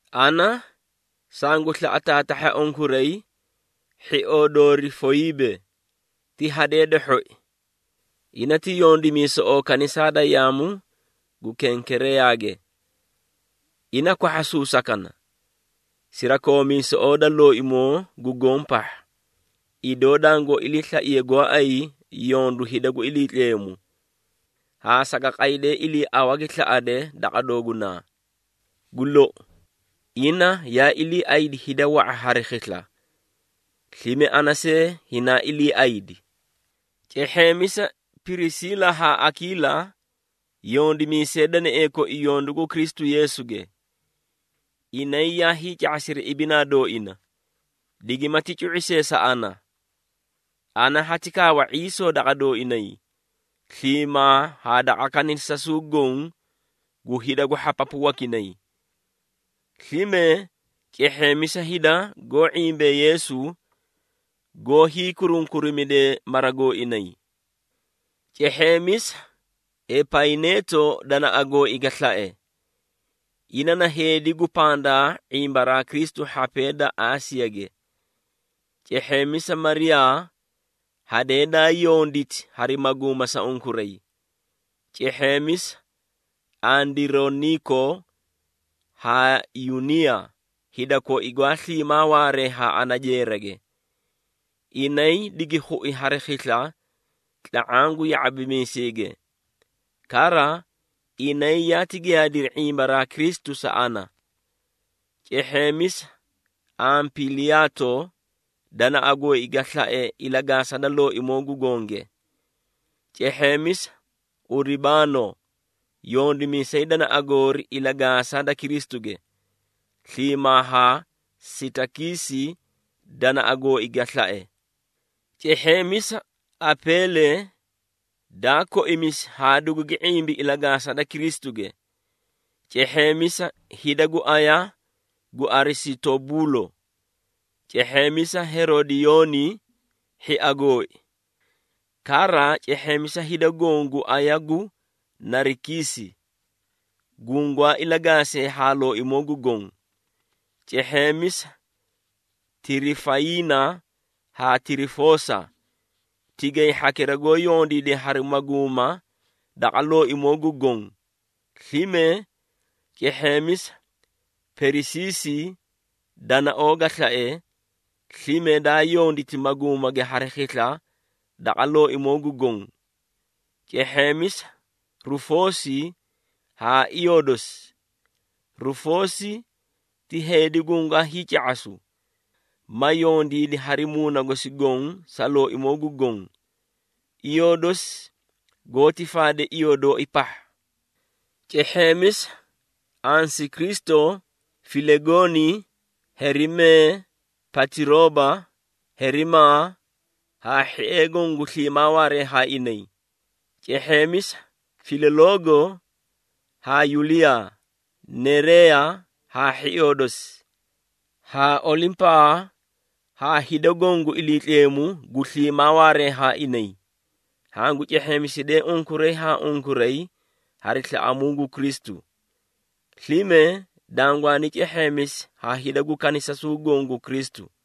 Ana, sangu slaꞌa taatahha unkuray, hhioo doorii Foyiibe, ti hadee da hhoi. Ina ti yondimiisoꞌoo kanisaa da yaamu gu Kenkereeyage. Ina kwahhasuusakana, sirakoomiisoꞌoo da Looimoo gu Goõ pahha, idoo dangoó iliislaiye gooay yondu hida gu Iliitleemu, haa saga qaydee iliiawa gi slaꞌade daqa doogunaa. Gu lou, ina yaa iliiaꞌaydi hida wa⁄a hari khisla, slime ana see hinaa iliiaydi. Cehheemisa Pirisiila haa Akiila, yondimiisee danaee koi yondu gu Kristu Yeesuge. Inay yaa hiica⁄asiri ibinaa dooina, digimati cu⁄i see sa ana. Ana hati kaawa ⁄iisoo daqa dooinay, sliimaa haa daqa kanisasuu goõ gu hida gu hhapapu wakinay. Slime cehheemisa hida goó ⁄imbee Yeesu, goó hiikurunkurimidee mara gooinay. Cehheemisa Epayineeto danaꞌa gooi ga slae. Ina na heedi gu pandaa ⁄imbaraa Kristu hhapee da Aasiyage. Cehheemisa Mariyaa, hadee daa yonditi hari maguuma sa unkuray. Cehheemisa Andironiiko haa Yuniiya, hida koi gwaa sliimaa waaree haa ana jeerage. Inay digi khui hari khisla tla⁄aã gu ya⁄abimiiseege. Kara, inay yaati giyaadiri ⁄imbaraa Kristu sa ana. Cehheemisa Ampiliyaato, danaꞌa gooi ga slae ilagaasa da Looimoo gu Gonge. Cehheemisa Uribaano, yondimiisay danaꞌa goori ilagaasa da Kristuge, sliimaa haa Sitakiisi danaꞌa gooi ga slae. Cehheemisa Apeele, daa koimisi haa dugugi ⁄imbi ilagaasa da Kristuge. Cehheemisa hida gu aya gu Arisitobuulo. Cehheemisa Herodiyooni, hhia gooi. Kara, cehheemisa hida goõ gu aya gu Narikiisi, gungwaa ilagaasee haa Looimoo gu Goõ. Cehheemisa Tirifayiina haa Tirifoosa, tigay hhakira goó yondiide hari maguuma daqa Looimoo gu Goõ. Slime cehheemisa Perisiisi danaoo ga slae, slime daa yonditi maguumage hari khisla daqa Looimoo gu Goõ. Cehheemisa Rufoosi haa iyoo dosi. Rufoosi ti heedi gungaa hiica⁄asu, ma yondiidi hari muuna gosi goõ sa Looimoo gu Goõ. Iyoo dosi goóti faade iyoo dooi pahha. Cehheemisa Asinkristo, Filegooni, Herimee, Patirooba, Herimaa, haa hhiee goõ gu sliimaa waaree haa inay. Cehheemisa Filoloogo haa Yuliyaa, Nereeya haa hhioo dosi, haa Olimpaa haa hida goõ gu Iliitleemu gu sliimaa waaree haa inay. Hangu cehheemisidee unkuray haa unkuray hari slaꞌamuu gu Kristu. Slime dangwaani cehheemisi ha hida gu kanisasuu goõ gu Kristu.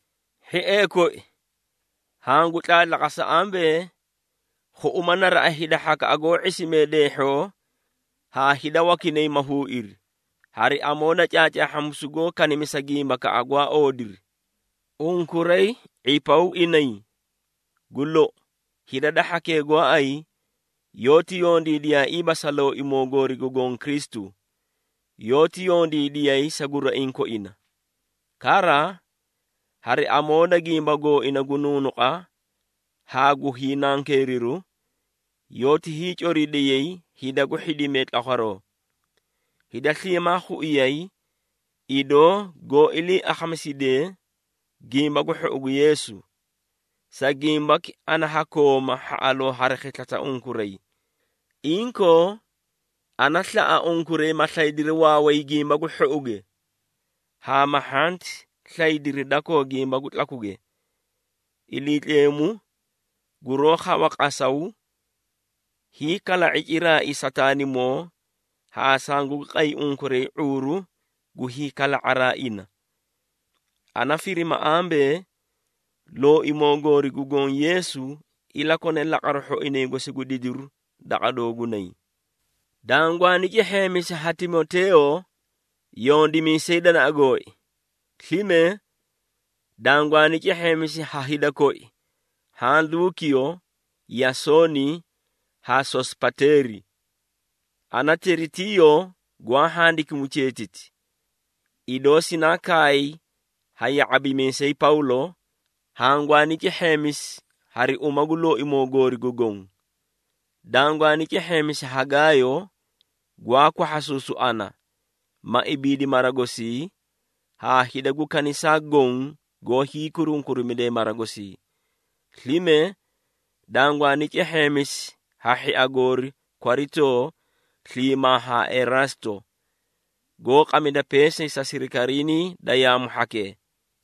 Hhiee koi, hangu tlaatlaqasa ambee, khuꞌuma naraꞌa hida hhakaꞌa goó ⁄isimee deehhoo haa hida wakinay ma huuiri, hari amoo da caacaahhamisu goó kanimisa gimbakaꞌa gwaa oodiri. Unkuray ⁄ipaw inay. Gu lou, hida da hhakee gooay yoóti yondiidiyaaiiba sa Looimoo goori gu Goõ Kristu, yoóti yondiidiyay sa guraiĩ koinay. Kara, hari amoo da gimba gooina gu nuunuqa haa gu hiinankeeriru, yoóti hiicoridiyay hida gu hhidimee tlakwaroo. Hida sliimaa khuiyay, idoo goó ilii akhamisidee Gimba gu Hhou gu Yeesu. Sa gimbaki ana ha kooma hhaꞌaloo hari khisla sa unkuray. Inkoo, ana slaꞌa unkuray, ma slaydiri waaway gimba gu hhouge haa ma hhanti slaydiri dakoo gimba gu tlakuge. Iliitleemu, guroó khawa qasaw, hiikala⁄i ciraai Sataanimoo haa sangugi qay unkuray ⁄uuru gu hiikala⁄araa ina. Ana firima ambee, Looimoo goori gu Goõ Yeesu ilakone laqaru hhoinay gosi gu didiru daqa doogunay. Dangwaani cehheemisi ha Timoteeyo, yondimiisay danaꞌa gooi. Slime, dangwaani cehheemisi ha hida koi haã Luukiyo, Yasooni haa Sosipateeri. Ana, Teritiiyo, gwaa handikimu cheetiti, idoo sinaa kaay ha ya⁄abimiisay Pawlo, hangwaani cehheemisi hari uma gu Looimoo goori gu Goõ. Dangwaani cehheemisi ha Gaayo, gwaa kwahhasuusu ana, ma ibiidi mara gosii haa hida gu kanisaa goõ goó hiikurunkurimidee mara gosii. Slime dangwaani cehheemisi ha hhia goori Kwaritoo sliimaa haa Eraasto, goó qamida peesay sa sirikariinii da yaamu hhakee.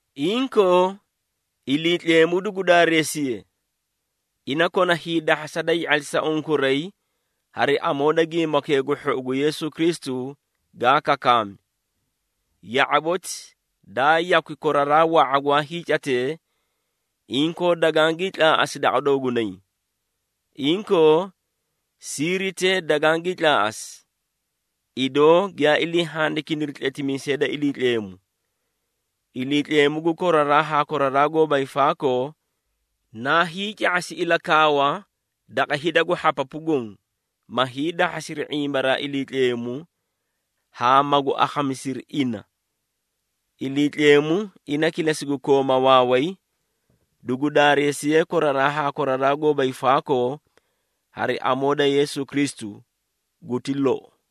Inkoo, Iliitleemu dugu daareesiye! Ina kona hiidahhasa da hii⁄atlisa unkuray hari amoo da Gimbakee gu Hhou gu Yeesu Kristu gaa kakaami. Ya⁄aboti, daa yakwi koraraa wa⁄a gwaa hiicatee, inkoo dagangii tlaaꞌasi daqa doogunay. Inkoo, siiritee dagangii tlaaꞌasi, idoo giyaa ilii handikiniri tletimiisee da Iliitleemu. Iliitleemu gu koraraa haa koraraa gooba hiifaakoo, naa hiica⁄asi ilakaawa daqa hida gu hhapapu goõ, ma hiidahhasiri ⁄imbaraa Iliitleemu haa magu akhamisiri ina. Iliitleemu, ina kilesi gu kooma waaway, dugu daareesiye koraraa haa koraraa gooba hiifaakoo hari amoo da Yeesu Kristu! Guti lou.